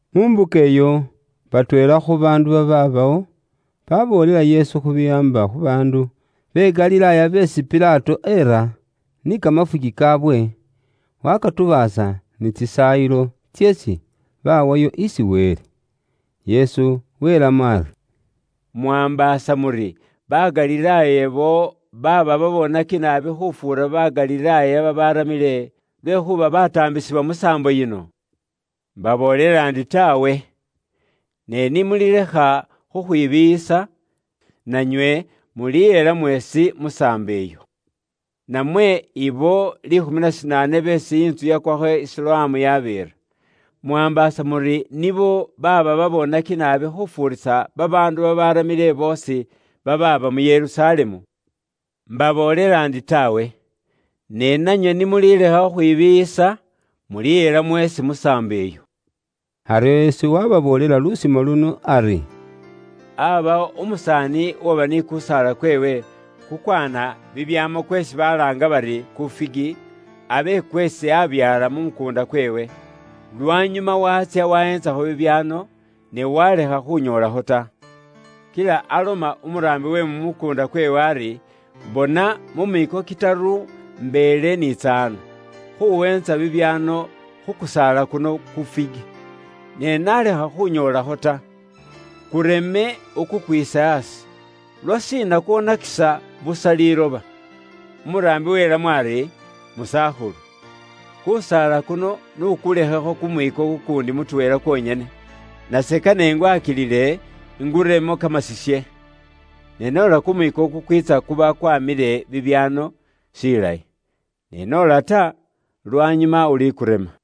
Mu mbuka iyo, batweela khu baandu babaabawo, baboolela Yesu khu biwaamba khu baandu be Galilaaya beesi Pilato eera, ni kamafuki kaawe, wakatubaasa ni tsisaayilo tseesi bawayo isi Wele. Yesu welamo ari, “Mwaambaasa muri ba Galilaaya ibo baaba babonaki naabi khufuura ba Galilaaya babaramile, lwekhuuba bataambisibwa musaambo yino? Mbaboolela indi taawe! Ne ni mulilekha khukhwibiiyisa, nanywe mulihela mweesi musaambo iyo. Namwe abo liikhumi na shinaane beesi intsu yakwakho i Siloamu yabeera. Mwaambaasa muri nibo baaba baboonaki naabi khufuurisa babaandu babaaramile boosi, babaaba mu Yerusalemu? Mbaboolela ndi taawe! Ne nanywe ni mulilekha khukhwibiiyisa, mulihela mweesi musaambo iyo.” Aryo Yesu waababoolela lusimo luno ari: “Aabawo umusaani uwaba ni kusaala kweewe kukwaana bibyaamo kweesi balaanga bari ku figi, abe kweesi aabyaala mu mukuunda kweewe. Lwanyuma waatsya waweentsakho bibyaano, ne waalekha khunyoolakho ta. Kila aloma umuraambi we mu mukuunda kweewe ari, ‘Bona, mu miiko kitaru mbeele niitsa ano, khuweentsa bibyaano khu kusaala kuno ku figi, ne nalekha khunyoolakho ta. Kureme ukukwiise aasi. Lwashiina kwonakisa busa liiloba?’ “Umuraambi welamo ari, ‘Musakhulu, kusaala kuno n'ukulekhekho kumwiiko kuundi mutweela kwonyene, nase kane ingwakilile, inguremo kamasisye. Ne noola kumwiiko kukwiitsa kuba kwamile bibyaano, shilayi. Ne noola ta, lwanyuma ulikurema.’”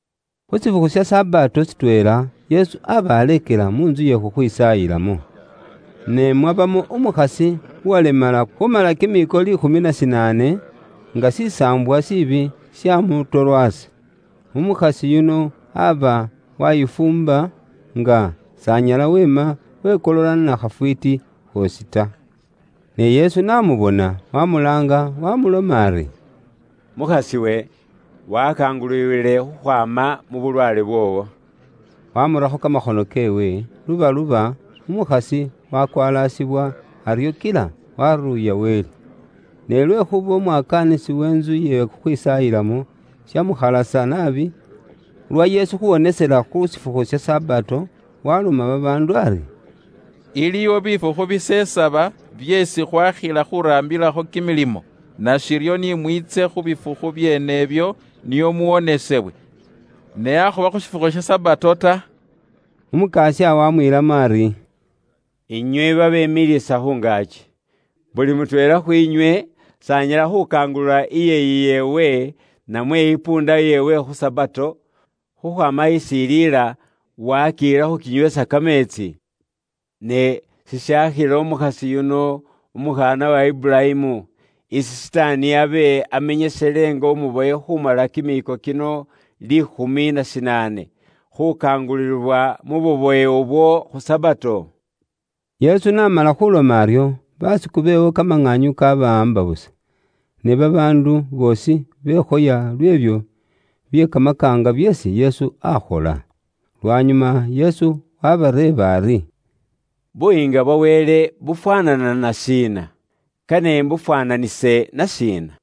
Khu shifukhu sha Sabato shitweela, Yesu aba aleekela mu ntsu iye khukhwisaayilamo. Ne mwabamo umukhasi uwalemala khumala kimiiko liikhumi na shinaane, nga shisaambwa shiibi shamutorwasa. Umukhasi yuno aba wayifuumba, nga s'anyala weema wekolola na khafwiiti khoosi ta. Ne Yesu n'amubona, wamulaanga, wamuloma ari, “Mukhas'iwe, wakangululiwile khukhwaama mu bulwaale bwoowo.” Wamurakho kamakhono keewe, lubaluba, umukhasi wakwalasibwa, aryo kila waruuya Wele. Ne lwekhuuba umuraangilisi wentsu ye khukhwisaayilamo shamukhalasa naabi, lwa Yesu khuwonesela khu shifukhu Sabato, waloma babaandu ari, “Iliwo bifukhu bisesaba byeesi khwakhila khuraambilakho kimilimo, nashiryo ni mwiitse khu bifukhu byeenebyo nio muwonesewe, ne akhuba khu shifukhu sha Sabato ta.” Umukasya wamwiilamo ari, “Inywe babemiliisa busa khu ngaaki! Buli mutweela khwiinywe s'anyala khukaangulula iyeeyi yeewe, namwe isikilya yeewe khu Sabato, khukhwaama isi iliila, waakiyila khukinyweesa kameetsi? Ne sishaakhila umukhasi yuno, umukhaana wa Iburayimu, isi Sitaani abe amenyesele nga umubowe khumala kimiiko kino liikhumi na shinaane, khukangululibwa mu bubowe ubwo khu Sabato?” Yesu n'amala khuloma aryo, basiku beewe kamaŋaanyu kabawaamba busa, ne babaandu boosi bekhoya lw'ebyo bye kamakaanga byeesi Yesu akhola. Lwanyuma Yesu wabareeba ari, “Buyiinga bwa Wele bufwaanana na shiina? Kane imbufwaananise na shiina?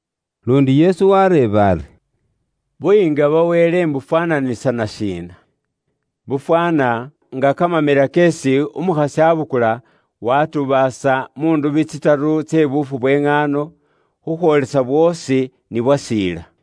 Luundi Yesu wareeba ari, “Buyiinga bwa Wele mbufwaananisa na shiina? Bufwaana nga kamamela keesi umukhasi abukula watubaasa mu ndubi tsitaru tse buufu bwe ŋaano, khukhwoolesa bwoosi ni bwasiila.”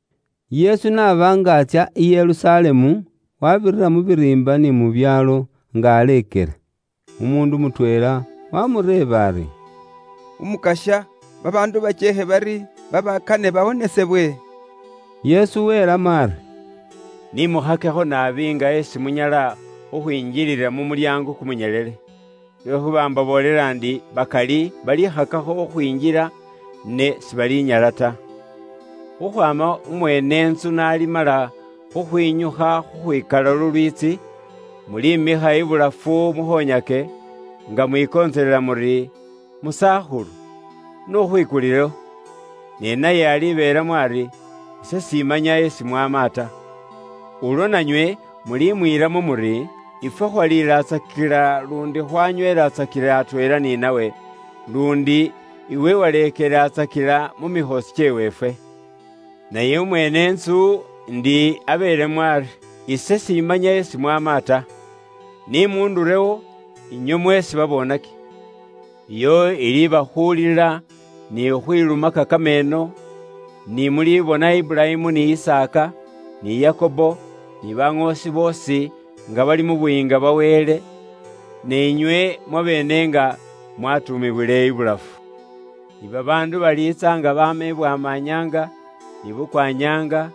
Yesu n'aba nga atsya i Yerusalemu, wabira mu biriimba ni mu byaalo nga aleekela. Umuundu mutweela waamureeba ari, “Umukasya babaandu bakyeekhe bari babakane bawonesebwe?” Yesu welamo ari, “Ni mukhakekho naabi nga esi munyala khukhwinjilila mu mulyaango kumunyelele. Lwekhuuba mbaboolela ndi bakali balikhakako khukhwinjila ne sebalinyala ta. Khukhwaama umweene intsu n'alimala khukhwinyukha khukhwikalawo lulwiitsi, mulimikha ibulafu mukhonyake, nga mwikontselela muri, ‘Musakhulu n'ukhwikulilewo.’ Ne naye alibeelamo ari, ‘Ise simanya isi mwaama ta.’ “Ulwo nanywe mulimwiilamo muri, ‘Ifwe khwaliilatsakila luundi khwanyweelatsakila atweela ni nawe, luundi iwe waleekelelatsakila mu mikhoosi kyeweefwe.’ “Naye umweene intsu indi abeelemo ari, ‘Ise simanya isi mwaama ta! Ni muundurewo, inywe mweesi mumuukhola bye bubwoonaki.’ “Iyo iliiba khulila ni khukhwilumaka kameeno, ni mulibona Iburayimu ni Isaaka, ni Yakobo, ni baŋoosi boosi, nga bali mu Buyiinga bwa Wele, ne inywe mwabeene nga mwatuumiwile ibulafu. Ni babaandu baliitsa nga baama ibwama nyaanga, ni bukwa nyaanga,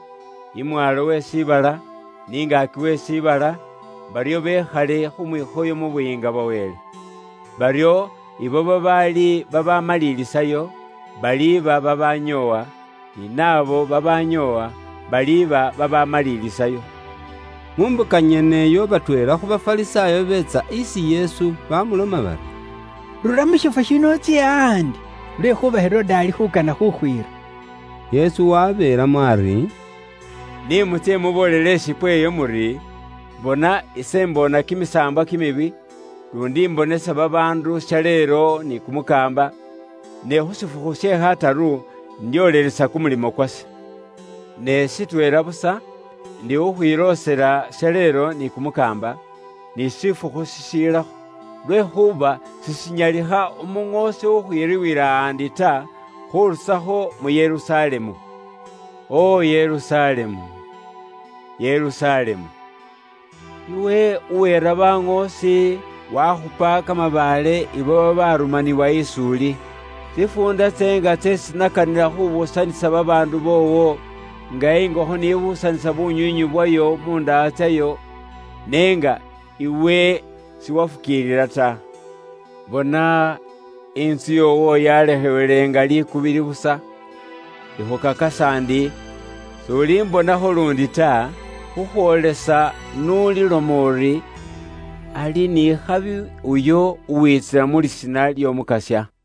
imwaalo we shiibala, ni ngaaki we shiibala, baryo bekhale khu mwikhoyo mu Buyiinga bwa Wele. Baryo ibo babaali bamalilisayo, baliba babanyoowa, ni naabo babanyoowa, baliba babamalilisayo.” Mu mbuka nyeneyo batweela khu Bafarisaayo biitsa isi Yesu bamuloma bari, “Rura mu shifwo shino utsye ahaandi, lwekhuuba Herode ali khuukana khuukhwiira.” Yesu waabeelamo ari, “Ni mutsye muboolele ishipwe iyo muri, ‘Bona ise imboona kimisaambwa kimibi, luundi imbonesa babaandu shaleelo ni kumukaamba, ne khu shifukhu she khataru, indyoolelesa kumulimo kwase.’ Ne shitweela busa, ndikhukhwiloosela shaleelo ni kumukaamba, ni shifukhu shishilakho, lwekhuuba sishinyalikha Umuŋoosi khukhwiribwila ahandi ta, khurusakho mu Yerusalemu. “O Yerusalemu! Yerusalemu! Iwe uwiira baŋoosi, wakhupa kamabaale ibo babarumaniwa is'uli. Tsifuunda tseenga tseesi nakanila khubuusanisa babaandu boowo, nga ingokho ni buusanisa bunywiinywi bwayo mu ndaha tsayo n'enga iwe siwafukiilila ta! Bona, intsu yoowo yalekhewele nga likubili busa. Ikhukakasa ndi s'ulimbonakho luundi ta, khukhwoolesa n'uli loma uri, ‘Ali ni khabi uyo uwiitsila mu lisiina ly'Omukasya.’”